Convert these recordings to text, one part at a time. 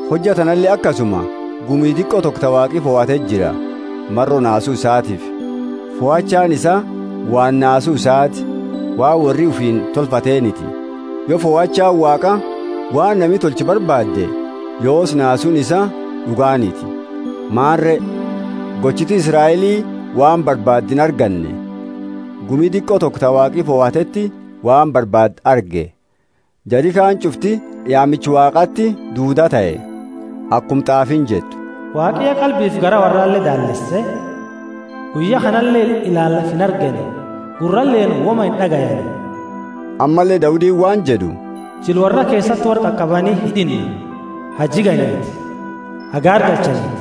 Hojja tanale akasuma: gumi diqo toko ta Waaqi fahateti jira, maro naasu isaatiifi. Fohachaani isaa waan naasu isaati, waan worri ufiini tolfateeniti. Yo fohachaani Waaqa waan nami tolchu barbaadde, yoosi naasuuni isaa d'uganiti. Maani re? Gochiti Israeli waan barbaadde inarganne. Gumi diqo toko ta Waaqi fohateti waan barbaadde arge; jari kaani ch'ufti yaamicha Waaqati duudaa tahe. Akuma t'aafiini jettu, Waaqi ya qalbifi garaa worrale daalleese; guyya kanale ilaani lafa inargani, gurraleeni woma ind'agayani. Ammalle Daudiini waan jed'u, Jila worra keesati worra qaqabani hid'inna, ha jiganiti, ha gaargalchaniti!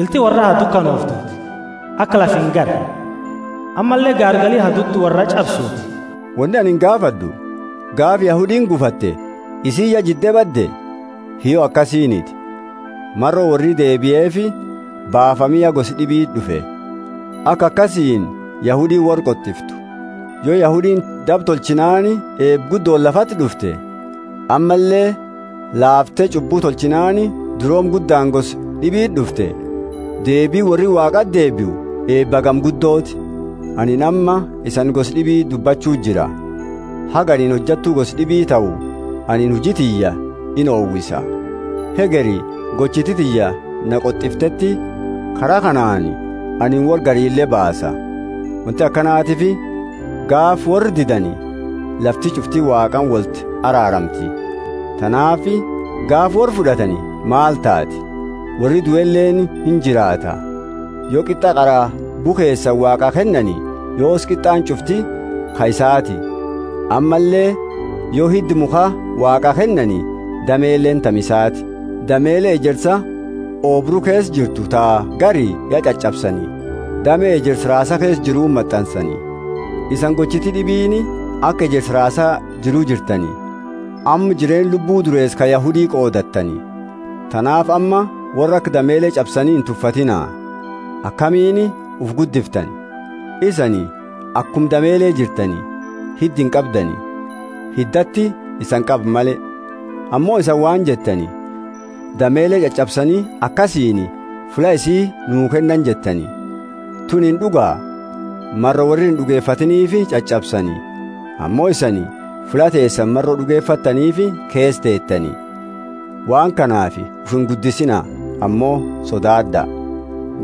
Ilti worra ha dukanooftuti, aka lafa ingarre; ammalle gaargali ha dudda worra ch'absuuti. Woni anini gaafad'u: Gaafa Yahudiini gufate isiini ya jidde badde? Hiyyo akasiiniti. Maro worri dabeefi baafami ya gosa d'ibiti d'ufe, aka akasiini Yahudiini worra qot'iftu. Yo Yahudiini daba tochinaani eeba guddooni lafati d'ufte, ammalle laafte ch'ubbu tolchinaani durooma guddaani gosa d'ibii d'ufte, deebiini worri Waaqati deebiu eeba hagami guddoti! Anini amma isani gosa d'ibiti dubbachu jira: haga anini hojattu gosa d'ibi tahu anini huji tiyya inowisa. Hegeri gochiti tiyya na qot'ifte kara kanaani anini worra garile baasa. Wonti akanatiifi gaafa worra didani, lafti ch'ufti Waaqaani wolti araaramti. Tanaafi gaafa worra fud'atani maal taati? Worri dueleeni injiraata. Yo qit'a qara bukheesani Waaqaa kennani, yoosi qit'aani ch'ufti ka isaati; ammalle yo hidda mukha Waaqaa kennani, dameleeni tami isaati. Damele ejersa oobru keesa jiru ta gari ya ch'ach'absani, dame ejersa raasa keesa jiruti mat'ansani. Isani gochiti d'ibiini aka ejersa raasa jiru jirtani, amma jireenna lubbu dureesa ka Yahudi qoodattani. Tanaafi amma worra aka damele ch'absani intufatiina. Akamiini ufi guddiftani? Isani akuma damele jirtani; hidda inqabdani, hiddati isani qaba male. Ammo isani waan jettani, Damele ch'ach'absani akasiini fulla isii nuu kennani jettani. Tunini d'uga. Maro worri ind'ugefatiiniifi ch'ach'absani, ammo isani fulla teesani maro d'ugefattaniifi keesa teetani. Waan kanaafi ufi inguddisiina, ammo sodaad'a.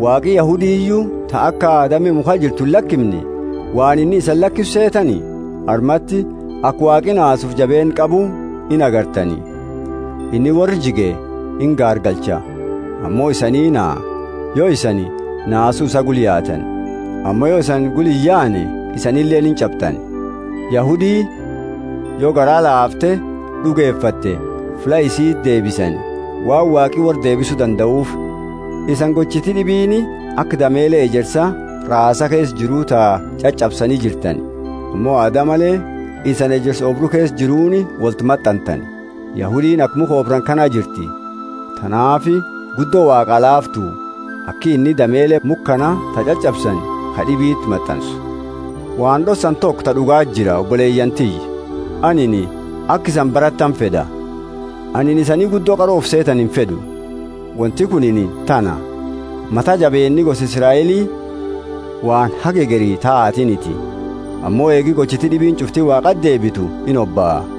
Waaqi Yahudiyu ta aka dame mukha jirtu illakimne, waan inni isani lakisu seetani? Armati aka Waaqi naasufi jabeenna qabu ingartani. Inni worra jige ingaargalcha, ammo isanii naha, yo isani naasu isaa gula yaatani; ammo yo isani gula iyaane, isanileeni inch'abdani. Yahudi, yo garaa laafte d'ugefatte, fulla isiiti deebisani, waan Waaqi worra deebisu dandaufi. Isani gochiti d'ibiini aka damele ejersa raasa keesa jiru, ta ch'ach'absani jirtani, ammo aada male isani ejersa oobru keesa jiruuni wolti mat'antani. Yahudiini aka mukha oobrani kana jirti; tanaafi guddo Waaqaa laaftu, aki inni damele mukha kana ta ch'ach'absani ka d'ibiti mat'ansu. Waan d'ossani toko ta d'ugaati jira, oboleyaani tiyya, anini aka isani baratani fed'a. Anini isanii guddo qaro ufi seetani infed'u. Wonti kunini tana: mata jabeenni gosa Israeli waan haga hegeri taatiniti ammo eegi gochiti d'ibiini ch'ufti Waaqati deebitu inhobaa.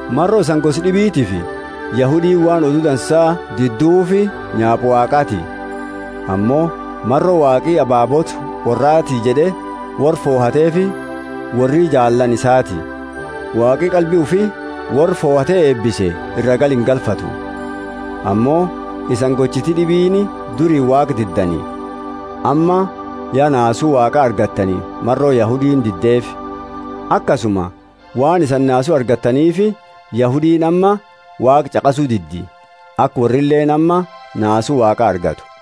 Maro isani gosa d'ibitiifi Yahudiini waan Odu Dansa diduufi nyaapa Waaqati. Ammo maro Waaqi ababoota worrati jed'e worra fohateefi worri jaallaani isaati Waaqi qalbi ufi worra fohate eebise iraa garaingalfatu. Ammo isani gochiti d'ibiini duri Waaqa diddani, amma ya naasu Waaqa argattani maro Yahudiini diddeefi. Akasuma, waan isani naasu argattaniifi, Yahudiini amma Waaqa ch'aqasu diddi, aka worrileeni amma naasu Waaqa argatu.